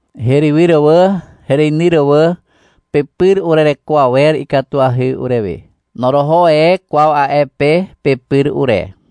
Herywyr wà, hereinyr wà. Pepyr urereko awer ikatuahy urewe. Noroho e kwaw a'e pe pepyr ure.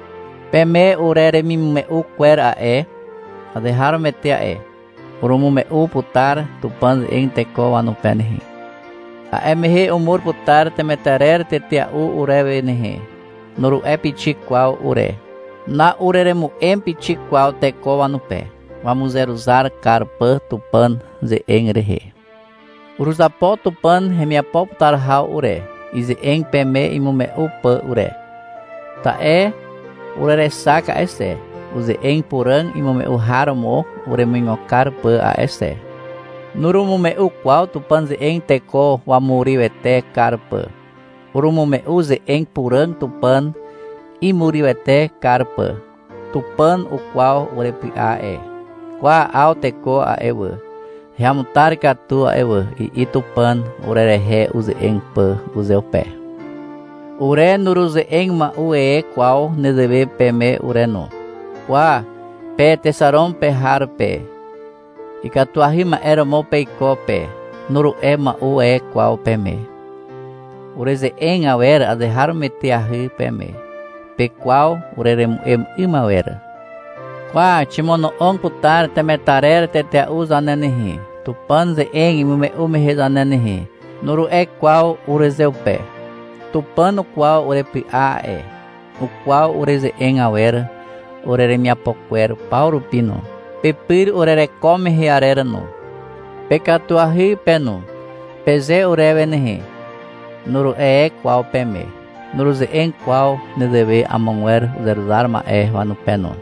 Peme ureremimume'u kwer a'e, azeharomoete a'e. — Urumume'u putar Tupàn ze'eg teko wanupe nehe. A'e mehe umur putar temetarer tetea'u urewe nehe, nuru'e pixik kwaw ure. Na'ureremu'em pixik kwaw teko wanupe, wamuzeruzar kar pà Tupàn ze'eg rehe. Uruzapo Tupàn hemiapo putar haw ure, ize'eg peme imume'u pà ure. Ta'e urerexak a'e xe, uze'eg puràg imume'u har romo uremuigo kar pà a'e xe. Nurumume'u kwaw Tupàn ze'eg teko wamurywete kar pà. Urumume'u ze'eg puràg Tupàn imurywete kar pà. Tupàn ukwaw urepy'a a'e. — Kwa, 'aw teko a'e wà, heamutar katu a'e wà, i'i Tupàn, urerehe uze'eg pà uzeupe. Ure nuruze'eg mua'u e kwaw nezewe peme ure no. — Kwa, pe Texaron pe har pe, ikatuahy ma'e romo peiko pe, nuru'e mua'u e kwaw peme. Ureze'eg awer azeharomoeteahy peme. Pekwaw ureremu'em 'ym awer. — Kwa, ximono'og putar temetarer tetea'u zane nehe, Tupàn ze'eg imume'u mehe zane nehe, nuru'e kwaw urezeupe. Tupàn ukwaw urepy'a a'e. Ukwaw ureze'eg awer ureremiapo kwer paw rupi no, pepyr urereko mehe arer no. — Pekatuahy pe no, peze urewe nehe, nuru'e e kwaw peme. Nuruze'eg kwaw nezewe amogwer uzeruzar ma'e wanupe no.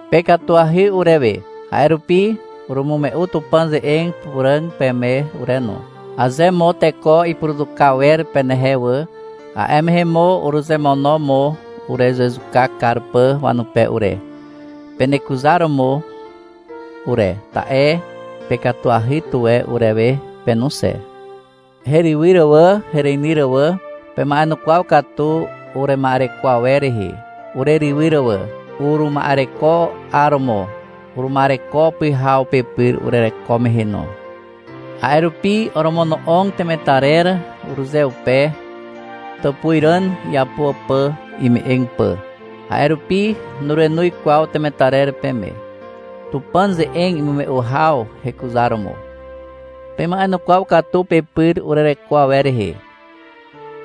Pekatuahy urewe. A'e rupi urumume'u Tupàn ze'eg puràg peme ure no. Aze mo teko ipuruzuka wer penehe wà, a'e mehe mo uruzemono mo urezezuka kar pà wanupe ure, penekuzar romo mo ure, ta'e pekatuahy tuwe urewe pe no xe. Herywyr wà, hereinyr wà. Pema'enukwaw katu urema'ereko awer rehe, urerywyr wà. Uruma'ereko 'aromo. Uruma'ereko pyhaw pepyr urereko mehe no. A'e rupi oromono'og temetarer urezeupe, tàpuzràn iapo pà ime'eg pà. A'e rupi nurenoz kwaw temetarer peme, Tupàn ze'eg imume'u haw hekuzaromo. Pema'enukwaw katu pepyr urereko awer rehe.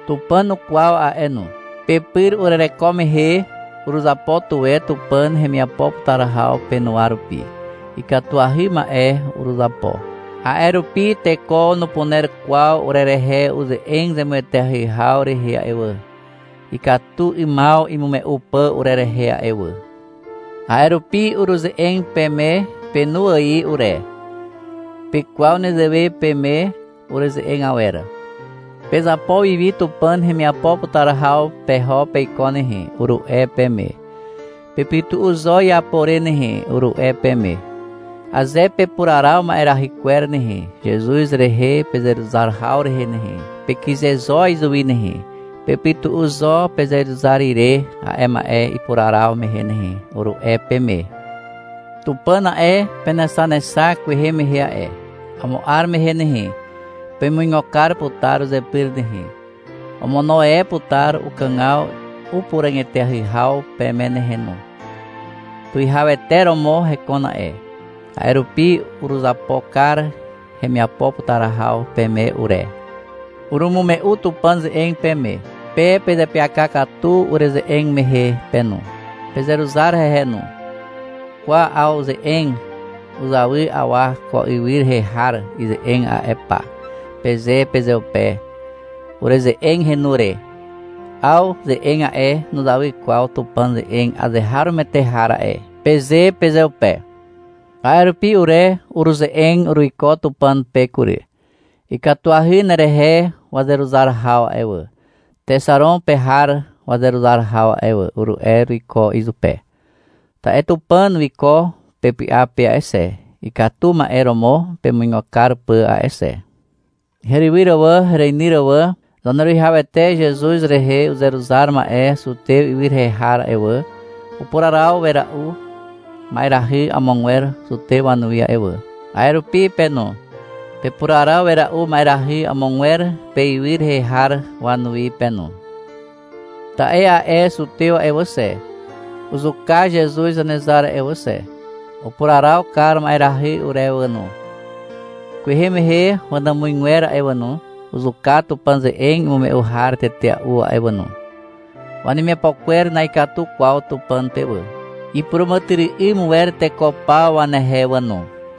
Tupàn ukwaw a'e no. Pepyr urereko mehe, uruzapo tuwe Tupàn hemiapo putar haw penuwa rupi. Ikatuahy ma'e uruzapo. A'e rupi teko nupuner kwaw urerehe uze'eg zemueteahy haw rehe a'e wà, ikatu 'ymaw imume'u pà urerehe a'e wà. A'e rupi uruze'eg peme penu ài ure. Pekwaw nezewe peme ureze'eg awer. — Pezapo wiwi Tupàn hemiapo putar haw peho peiko nehe, uru'e peme. — Pepytu'u zo iapo re nehe, uru'e peme. — Aze pepuraraw ma'erahy kwer nehe, Zezuz rehe pezeruzar haw rehe nehe, pekyze zo izuwi nehe, pepytu'u zo pezeruzar ire a'e ma'e ipuraraw mehe nehe, uru'e peme. Tupàn a'e, penexanexak kwehe mehe a'e. Amo 'ar mehe nehe, pemuigo kar putar uzepyr nehe, omono e putar ukàgaw upuràg eteahy haw peme nehe no. (Tuwihawete romo hekon a'e.) A'e rupi uruzapo kar hemiapo putar haw peme ure. Urumume'u Tupàn ze'eg peme. Pe pezeapyaka katu ureze'eg mehe pe no. Pezeruzar hehe no. — Kwa, 'aw ze'eg uzawy awa ko ywy rehe har ize'eg a'e pa, peze pezeupe ureze'eg henu re. — Aw ze'eg a'e, nuzawy kwaw Tupàn ze'eg azeharomoete har a'e, peze pezeupe. A'e rupi ure uruze'eg uruiko Tupàn pe kury. — Ikatuahy nerehe wazeruzar haw a'e wà, Texaron pe har wazeruzar haw a'e wà, uru'e uruiko izupe. Ta'e Tupàn wiko pepy'a pe a'e xe, ikatu ma'e romo pemuigo kar pà a'e xe. Herywyr wà, hereinyr wà. Zaneruwihawete Zezuz rehe uzeruzar ma'e Zutez ywy rehe har a'e wà, upuraraw wera'u ma'erahy amogwer zutew wanuwi a'e wà. A'e rupi pe no. Pepuraraw wera'u ma'erahy amogwer peywy rehe har wanuwi pe no. Ta'e a'e zutew a'e wà xe, uzuka Zezuz Zanezar a'e wà xe. Upuraraw kar ma'erahy urewe wà no. Kwehe mehe wanàmuzgwer a'e wà no, uzuka Tupàn ze'eg imume'u har tetea'u a'e wà no. Wanemiapo kwer na'ikatu kwaw Tupàn pe wà. Ipuràmàtyry'ym wer teko paw wanehe wà no.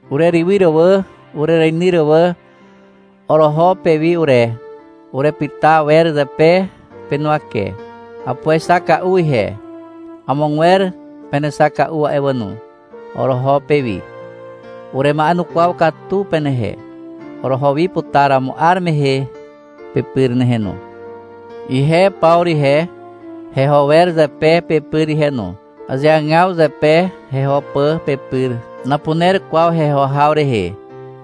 Urerywyr wà, urereinyr wà. Oroho pewi ure. Urepyta wer zepe penuwake. Apuexaka'u ihe. Amogwer penexaka'u a'e wà no. Oroho pewi. Urema'enukwaw katu penehe. Oroho wi putar amo 'ar mehe pepyr nehe no. Ihe Pawru ihe, heho wer zepe pepyr ihe no. Azeagaw zepe heho pà pepyr. Napuner kwaw heho haw rehe.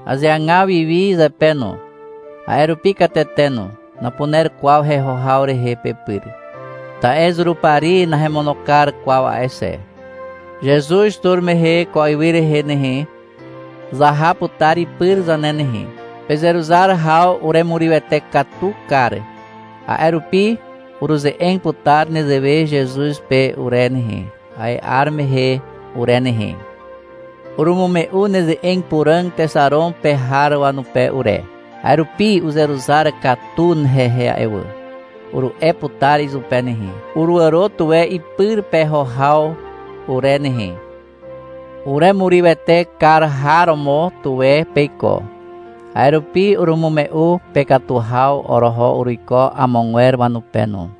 Azeagaw wiwi zepe no. A'e rupi katete no. Napuner kwaw heho haw rehe pepyr. Ta'e Zurupari nahemono kar kwaw a'e xe. Zezuz tur mehe ko ywy rehe nehe, zaha putar ipyr zane nehe. Pezeruzar haw uremurywete katu kar. A'e rupi uruze'eg putar nezewe Zezuz pe ure nehe, a'e 'ar mehe ure nehe. — Urumume'u neze'eg puràg Texaron pe har wanupe ure. A'e rupi uzeruzar katu hehe a'e wà, uru'e putar izupe nehe. Uruàro tuwe ipyr peho haw ure nehe. Uremurywete kar har romo tuwe peiko. A'e rupi urumume'u pekatu haw oroho uruiko amogwer wanupe no.